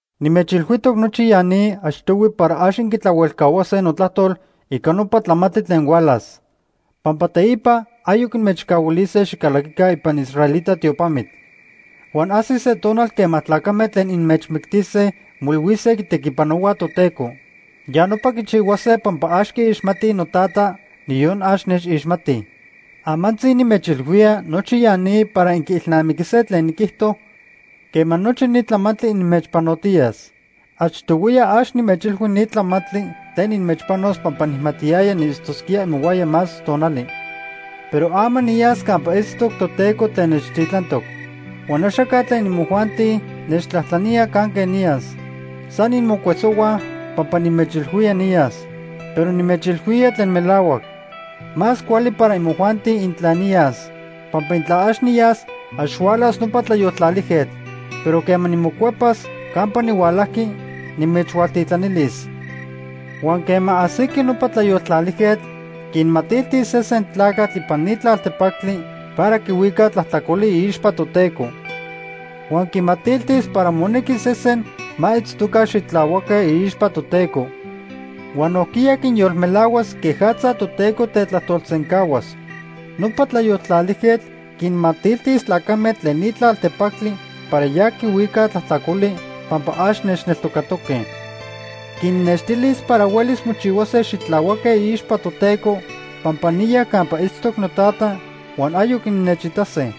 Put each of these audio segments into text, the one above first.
“Nimechilhuijtoc nochi ya ni achtohui para ax inquitlahuelcahuase notlajtol ica nopa tlamantli tlen hualas. Pampa teipa ayoc inmechcahuilise xicalaquica ipan israelita tiopamitl. Huan ajsis se tonal quema tlacame tlen inmechmictise moilhuise quitequipanohuaj Toteco. Ya nopa quichihuase pampa ax quiixmatij noTata, niyon ax nechixmatij. Amantzi nimechilhuía nochi ya ni para inquiilnamiquise tlen niquijto quema nochi ni tlamantli inmechpanotiyas. “Achtohuiya ax nimechilhui ni tlamantli tlen inmechpanos pampa nijmatiyaya niitztosquía imohuaya más tonali. Pero ama niyas campa itztoc Toteco tlen nechtitlantoc. Huan axaca tlen imojuanti nechtlajtlanía canque niyas. San inmocuesohuaj pampa nimechilhuía niyas. Pero nimechilhuía tlen melahuac. Más cuali para imojuanti intla niyas. Pampa intla ax niyas, ax hualas nopa Tlayoltlalijquetl. Pero quema nimocuepas campa nihualajqui, nimechhualtitlanilis. Huan quema ajsiqui nopa Tlayoltlalijquetl, quinmatiltis sesen tlacatl ipan ni tlaltepactli para quihuica tlajtlacoli iixpa Toteco. Huan quimatiltis para monequi sesen ma itztoca xitlahuaque iixpa Toteco. Huan nojquiya quinyolmelahuas quejatza Toteco tetlajtolsencahuas. Nopa Tlayoltlalijquetl quinmatiltis tlacame tlen ni tlaltepactli para ya quihuicaj tlajtlacoli pampa ax nechneltocatoque. Quinnextilis para huelis mochihuase xitlahuaque iixpa Toteco pampa niya campa itztoc noTata huan ayoc innechitase.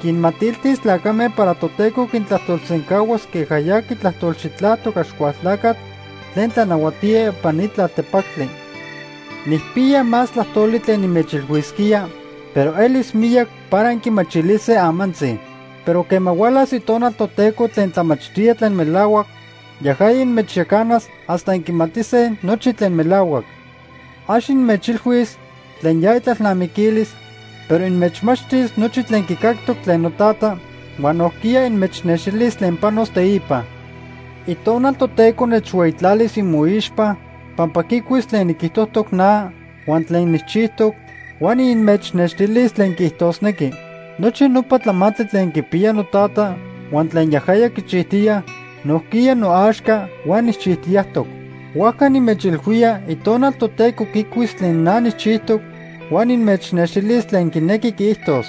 Quinmatiltis tlacame para Toteco quintlajtolsencahuas queja ya quitlajtolxitlajtoc Axcualtlacatl tlen tlanahuatía ipan ni tlaltepactli. “Nijpiya más tlajtoli tlen nimechilhuisquía, pero elis miyac para inquimachilise amantzi. Pero quema hualas Itonal Toteco tlen tlamachtía tlen melahuac, yajaya inmechyacanas hasta inquimatise nochi tlen melahuac. Ax inmechilhuis tlen ya itlalnamiquilis, pero inmechmachtis nochi tlen quicactoc tlen noTata, huan nojquiya inmechnextilis tlen panos teipa. Itonal Toteco nechhueyitlalis imoixpa pampa quicuis tlen niquijtojtoc na huan tlen nijchijtoc, huan inmechnextilis tlen quiijtosnequi. Nochi nopa tlamantli tlen quipiya noTata huan tlen yajaya quichijtiya nojquiya noaxca huan nijchijtiyajtoc. Huajca nimechilhuía Itonal Toteco quicuis tlen na nijchijtoc huan inmechnextilis tlen quinequi quiijtos.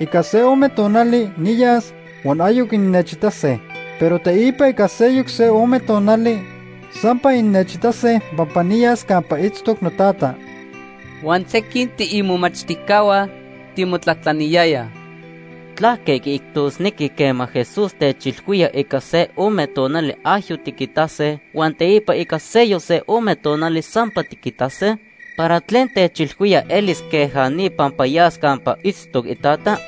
“Ica se ome tonali niyas huan ayoc innechitase. Pero teipa ica seyoc se ome tonali, sampa innechitase pampa niyas campa itztoc noTata.” Huan sequin tiimomachtijcahua timotlajtlaniyayaj: ―¿Tlaque quiijtosnequi quema Jesús techilhuía ica se ome tonali ayoc tiquitase, huan teipa ica seyoc se ome tonali sampa tiquitase? ¿Para tlen techilhuía elis queja ni pampa yas campa itztoc iTata?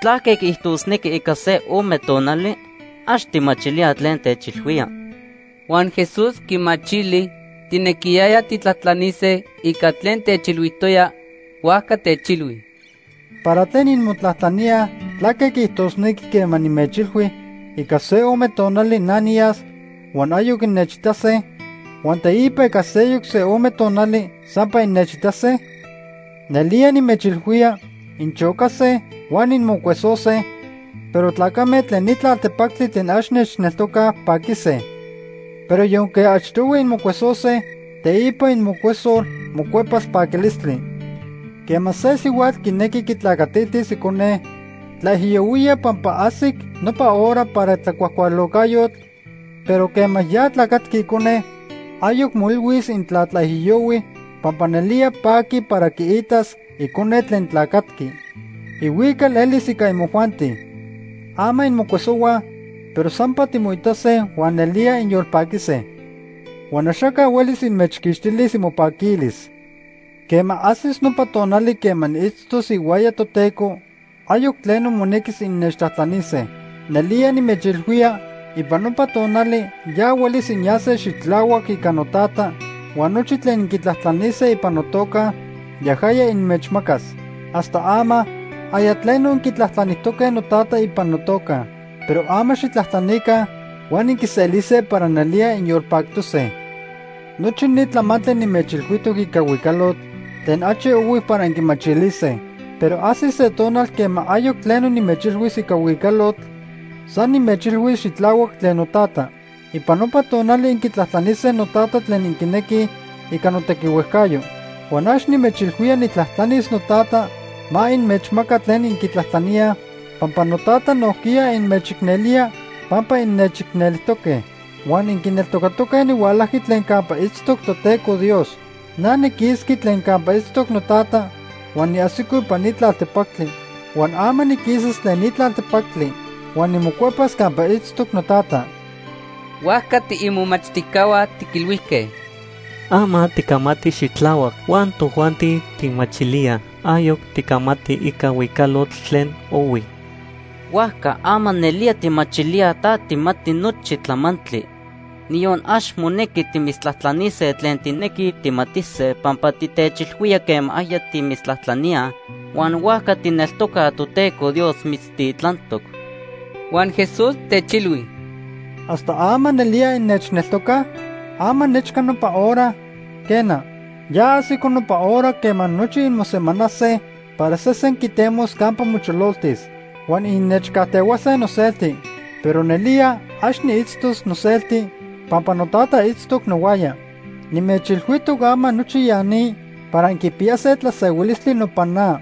¿Tlaque quiijtosnequi ‘ica se ome tonali’? Ax tijmachilíaj tlen techilhuía. Huan Jesús quimachili tijnequiyayaj tijtlajtlanise ica tlen techilhuijtoya, huajca techilhui: ―¿Para tlen inmotlajtlaníaj tlaque quiijtosnequi quema nimechilhui ica se ome tonali na niyas huan ayoc innechitase, huan teipa ica seyoc se ome tonali sampa innechitase? Nelía nimechilhuía inchocase huan inmocuesose, pero tlacame tlen ni tlaltepactli tlen ax nechneltocaj, paquise. Pero yonque achtohui inmocuesose, teipa imocuesol mocuepas paquilistli. Quema se sihuatl quinequi quitlacatiltis icone, tlaijiyohuía pampa ajsic nopa hora para tlacuajcualocayotl, pero quema ya tlacatqui icone, ayoc moilhuis intla tlaijiyohui pampa nelía paqui para quiitas icone tlen tlacatqui. Ihuical elis ica imojuanti. Ama inmocuesohuaj, pero sampa timoitase huan nelía inyolpaquise. Huan axaca huelis inmechquixtilis imopaquilis. “Quema ajsis nopa tonali quema niitztos ihuaya Toteco, ayoc tleno monequis innechtlajtlanise. Nelía nimechilhuía ipan nopa tonali ya huelis inyase xitlahuac ica noTata huan nochi tlen inquitlajtlanise ipan notoca, yajaya inmechmacas. Hasta ama aya tleno inquitlajtlanijtoque noTata ipan notoca. Pero ama xijtlajtlanica huan inquiselise para nelía inyolpactose. “Nochi ni tlamantli nimechilhuijtoc ica huicalotl tlen achi ohui para inquimachilise. Pero ajsis se tonal quema ayoc tleno nimechilhuis ica huicalotl, san nimechilhuis xitlahuac tlen noTata. Ipan nopa tonali inquitlajtlanise noTata tlen inquinequise ica notequihuejcayo. Huan ax nimechilhuía nijtlajtlanis noTata ma inmechmaca tlen inquitlajtlaníaj, pampa noTata nojquiya inmechicnelía pampa innechicnelijtoque. Huan inquineltocatoque nihualajqui tlen campa itztoc Toteco Dios. Na niquisqui tlen campa itztoc noTata huan niajsico ipan ni tlaltepactli. Huan ama niquisas tlen ni tlaltepactli. Huan nimocuepas campa itztoc noTata.” Huajca tiimomachtijcahua tiquilhuijque: ―Ama ticamati xitlahuac huan tojuanti tijmachilíaj. Ayoc ticamati ica huicalotl tlen ohui. Huajca ama nelía tijmachilíaj ta tijmati nochi tlamantli. Niyon ax monequi timitztlajtlanise tlen tijnequij tijmatise pampa titechilhuía quema aya timitztlajtlaníaj, huan huajca tijneltocaj Toteco Dios mitztitlantoc. Huan Jesús techilhui: ―¿Hasta ama nelía innechneltocaj? Ama nechca nopa hora, quena, ya ajsico nopa hora quema nochi inmosemanase para sesen quitemos campa mochololtis. Huan innechcajtehuase noselti. Pero nelía ax niitztos noselti pampa noTata itztoc nohuaya. Nimechilhuijtoc ama nochi ya ni para inquipiyase tlasehuilistli nopan na.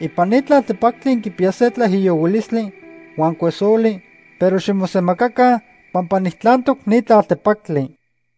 Ipan ni tlaltepactli inquipiyase tlaijiyohuilistli huan cuesoli, pero ximosemacaca pampa nijtlantoc ni tlaltepactli.